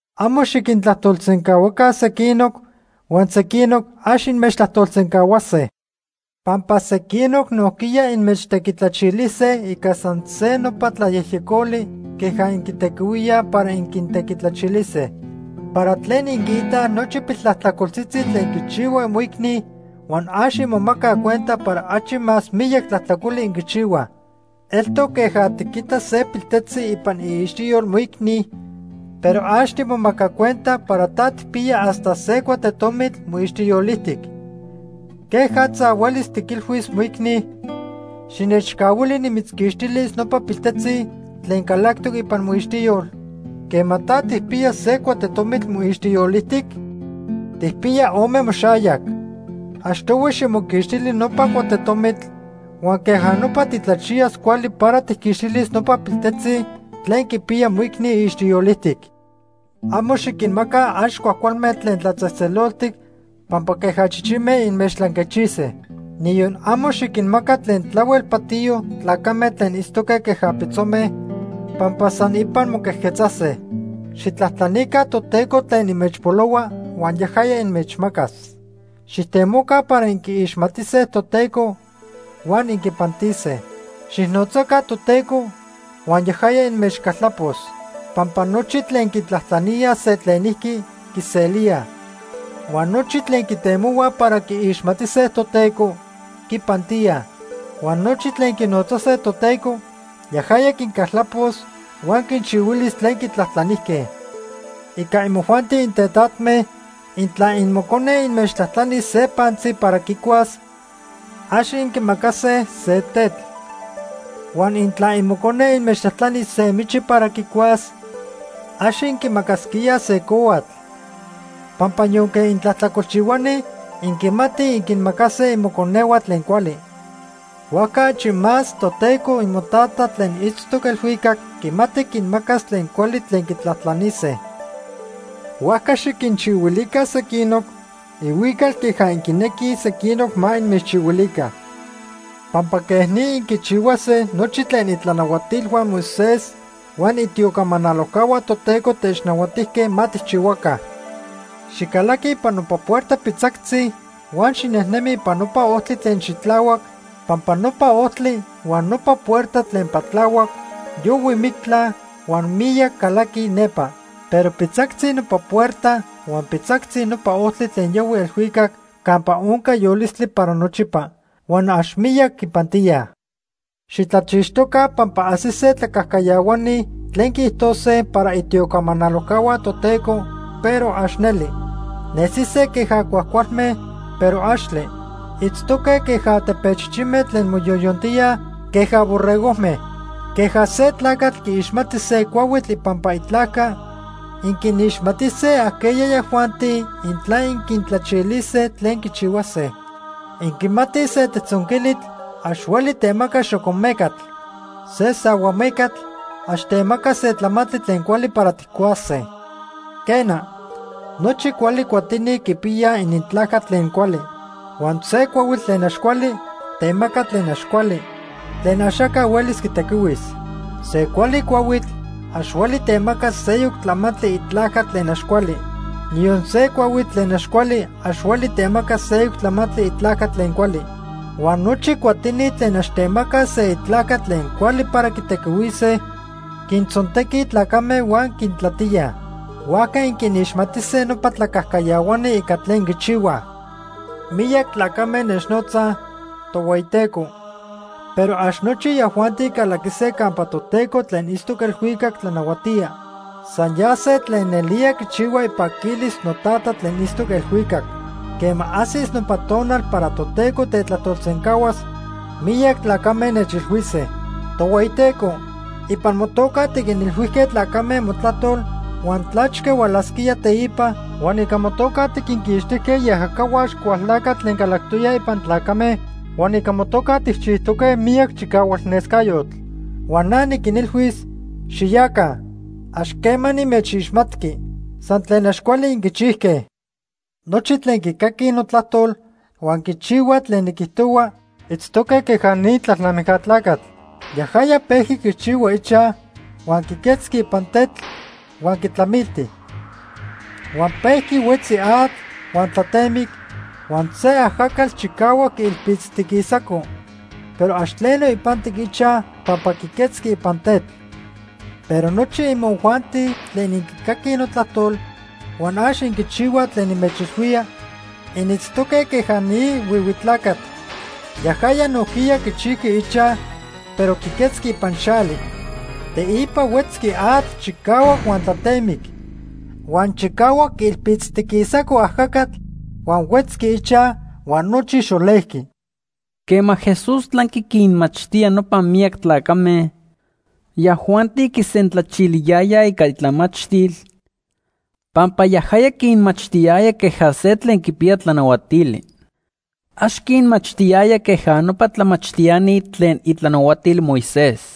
“Amo xiquintlajtolsencahuaca sequinoc, huan sequinoc ax inmechtlajtolsencahuase. Pampa sequinoc nojquiya inmechtequitlachilise ica san se nopa tlayejyecoli queja inquitequihuíaj para inquintequitlachilise. ¿Para tlen inquiitaj nochi piltlajtlacoltzitzi tlen quichihua imoicni huan ax inmomacaj cuenta para achi más miyac tlajtlacoli inquichihuaj? Eltoc queja tiquita se piltejtzi ipan iixtiyol moicni, pero ax timomaca cuenta para ta tijpiya hasta se cuatetomitl moixtiyol ijtic. ¿Quejatza huelis tiquilhuis moicni: ‘Xinechcahuili nimitzquixtilis nopa piltejtzi tlen calactoc ipan moixtiyol’, quema ta tijpiya se cuatetomitl moixtiyol ijtic? Tijpiya ome moxayac. Achtohui ximoquixtili nopa cuatetomitl, huan queja nopa titlachiyas cuali para tijquixtilis nopa piltejtzi tlen quipiya moicni iixtiyol ijtic. “Amo xiquinmaca ax cuajcualme tlen tlatzejtzeloltic pampa queja chichime inmechtlanquechise. Niyon amo xiquinmaca tlen tlahuel patiyo tlacame tlen itztoque queja pitzome, pampa san ipan moquejquetzase. “Xijtlajtlanica Toteco tlen inmechpolohua huan yajaya inmechmacas. Xijtemoca para inquiixmatise Toteco huan inquipantise. Xijnotzaca Toteco huan yajaya inmechcaltlapos. Pampa nochi tlen quitlajtlaníaj se tlenijqui, quiselíaj. Huan nochi tlen quitemohuaj para quiixmatise Toteco, quipantíaj. Huan nochi tlen quinotzase Toteco, yajaya quincaltlapos huan quinchihuilis tlen quitlajtlanijque. “Ica imojuanti intetatme, intla imocone inmechtlajtlanis se pantzi para quicuas, ax inquimacase se tetl. Huan intla imocone inmechtlajtlanis se michi para quicuas, ax inquimacasquíaj se cohuatl, pampa yonque intlajtlacolchihuani inquimatij inquinmacase imoconehua tlen cuali. Huajca achi más Toteco imoTata tlen itztoc elhuicac quimati quinmacas tlen cuali tlen quitlajtlanise. “Huajca xiquinchihuilica sequinoc, ihuical queja inquinequij sequinoc ma inmechchihuilica. Pampa quej ni inquichihuase nochi tlen itlanahuatilhua Moisés huan itiocamanalojcahua Toteco technahuatijque ma tijchihuaca. “Xicalaqui ipan nopa puerta pitzactzi huan xinejnemi ipan nopa ojtli tlen xitlahuac, pampa nopa ojtli huan nopa puerta tlen patlahuac yohui mictla huan miyac calaquij nepa. Pero pitzactzi nopa puerta huan pitzactzi nopa ojtli tlen yohui elhuicac campa onca yolistli para nochipa huan ax miyac quipantíaj. “Xitlachixtoca pampa ajsise tlacajcayahuani tlen quiijtose para itiocamanalojcahua Toteco, pero ax neli. Nesise queja cuajcualme, pero axtle. Itztoque queja tepechichime tlen moyoyontíaj queja borregojme. Queja se tlacatl quiixmati se cuahuitl ipampa itlajca, inquinixmatise ajqueya yajuanti intla inquitlachilise tlen quichihuase. Inquimatij se tejtzonquilitl ax hueli temaca xocomecatl. Se sahuamecatl ax temaca se tlamantli tlen cuali para tijcuase. Quena, nochi cuali cuatini quipiyaj inintlajca tlen cuali. Huan se cuahuitl tlen ax cuali temaca tlen ax cuali, tlen axaca huelis quitequihuis. Se cuali cuahuitl ax hueli temaca seyoc tlamantli itlajca tlen ax cuali, niyon se cuahuitl tlen ax cuali ax hueli temaca seyoc tlamantli itlajca tlen cuali. Huan nochi cuatini tlen ax temacaj se itlajca tlen cuali para quitequihuise, quintzontequij tlacame huan quintlatíaj. Huajca inquinixmatise nopa tlacajcayahuani ica tlen quichihuaj. “Miyac tlacame nechnotzaj: ‘Tohueyiteco’, pero ax nochi yajuanti calaquise campa Toteco tlen itztoc elhuicac tlanahuatía. San yase tlen nelía quichihuaj ipaquilis noTata tlen itztoc elhuicac. Quema ajsis nopa tonal para Toteco tetlajtolsencahuas, miyac tlacame nechilhuise: ‘Tohueyiteco, ipan motoca tiquinilhuijque tlacame motlajtol huan tlachque hualasquía teipa, huan ica motoca tiquinquixtijque iajacahua Axcualtlacatl tlen calactoyaj ipan tlacame, huan ica motoca tijchijtoque miyac chicahualnescayotl.’ Huan na niquinilhuis: ‘Xiyaca. Ax quema nimechixmatqui. San tlen ax cuali inquichijque.’ “Nochi tlen quicaquij notlajtol huan quichihuaj tlen niquijtohua itztoque queja ni tlalnamijca tlacatl. Yajaya pejqui quichihua ichaj huan quiquetzqui ipan tetl huan quitlamilti. Huan pejqui huetzi atl huan tlatemic, huan se ajacatl chicahuac quiilpitztiquisaco, pero ax tleno ipantic ichaj pampa quiquetzqui ipan tetl. Pero nochi imojuanti tlen inquicaquij notlajtol huan ax inquichihuaj tlen nimechilhuía, initztoque queja ni huihui tlacatl. Yajaya nojquiya quichijqui ichaj, pero quiquetzqui ipan xali. Teipa huetzqui atl chicahuac huan tlatemic. Huan chicahuac quiilpitztiquisaco ajacatl, huan huetzqui ichaj huan nochi xolejqui.” Quema Jesús tlanqui quinmachtía nopa miyac tlacame, yajuanti quisentlachiliyayaj ica itlamachtil, pampa yajaya quinmachtiyaya queja se tlen quipiya tlanahuatili. Ax quinmachtiyaya queja nopa tlamachtiani tlen itlanahuatil Moisés.